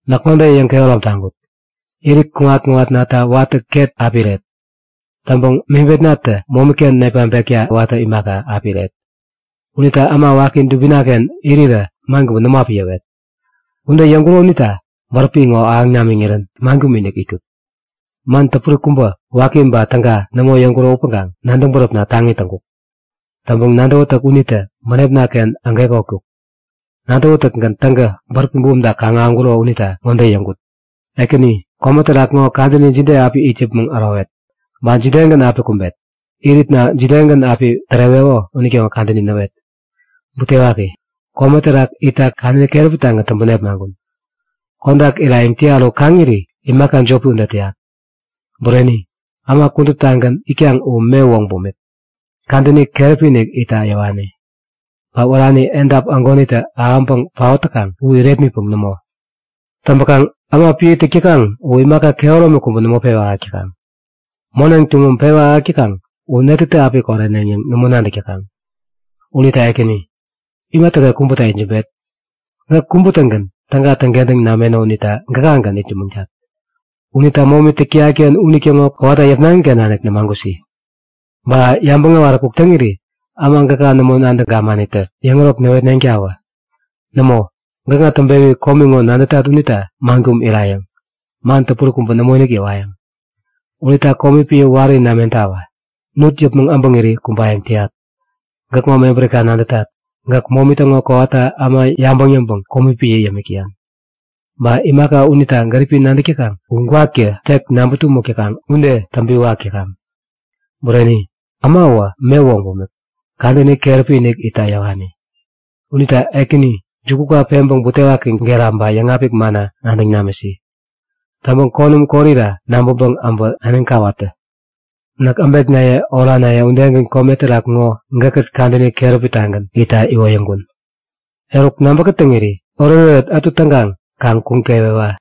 Näk ŋode yäŋkehärom taŋkut; Irit kuŋat-kuŋatnata watä ket api iret. Täŋpäŋ mebetnatä momiken nepmaŋpekta watä imaka, api iret. Unita äma waki dubinaken irirä man kubä nämo api yäwet. Ude yäŋkuro unita bäräpi ŋo ahäŋ namiŋirän man kum-inik itkut. Man täpuri kubä, waki ba täga nämo yäŋkuro upäŋkaŋ nadäŋ bäräpna taŋi täŋkuk. Täŋpäŋ nadäwätäk unitä bänepnaken agekotkuk. Nadäwätäkgän täŋkä bäräpi bumta kaŋ-ahäŋkuro unita ŋode yäŋkut; Ekäni, kome terak ŋo kadäni jide api it yäpmäŋ ärowet? Ba jidegän api kumbet? Iritna jidegän api täreweko unitäŋo kadäni näwet! Butewaki! Kome terak itta kadäni keräpitagän täŋpäŋ nepmaŋkun! Kodak irayäŋ täyat u kaŋiri imaka jopi ude täyak. Bureni, äma kuduptagän itkaŋ u me woŋ bumik, kadäni keräpi-inik itta yäwani. Ba wärani, edap ägonitä ahäŋpäŋ paot täkaŋ u irepmitpäŋ nämo. Täŋpäkaŋ äma piä täk täkaŋ u imaka kehäromi kubä nämo pewä ahäk täkaŋ. Moneŋ tuŋum pewä ahäk täkaŋ u netätä api koreneŋ yäŋ nämo nadäk täkaŋ. Unita Ekäni, imatäken kubäta itsämbet? Gäk kubä-tägän täga täŋkentäŋ nameno unita gakagän itsämäŋtat. Unita momi täk täyatken unitäŋo kowata yäpnaŋiken nanik nämagusi. Ba yabäŋ äwaräkuk täŋiri äma gäka nämo nadäŋ gamanitä yäŋärok näwetneŋtawä. Nämo, gäkŋa täŋpewi komi ŋo nadätat unita man kum irayäŋ. Man täpuri kubä nämoinik yäwayäŋ. Unita komi piä wari namentawä! Nut yäpmäŋ äbäŋiri kumbayäŋ täyat! Gäkŋo mebärika nadätat. Gäk momi täŋo kowata äma yabäŋ yäŋpäŋ komi piä yämik täyan. Ba imaka unita gäripi nadäk täkaŋ u gwaktä tek näŋpä tumäk täkaŋ ude täŋpiwak täkaŋ. Bureni, ämawä me woŋ bumik, kadäni keräpi-inik itta yäwani. Unita Ekäni, juku peŋpäŋ butewaki gera ba yäŋapik manna nadäŋ namisi. Täŋpäŋ konäm korira nabäŋpäŋ äbä naniŋ kawat tä. Näk äbeknaye oranaye udegän kome terak ŋo gäkkät kadäni keräpitagän itta iwoyäŋkun. Eruk nabä kätäŋiri oretoret ätu täŋkaŋ kaŋ kuŋ kewewa!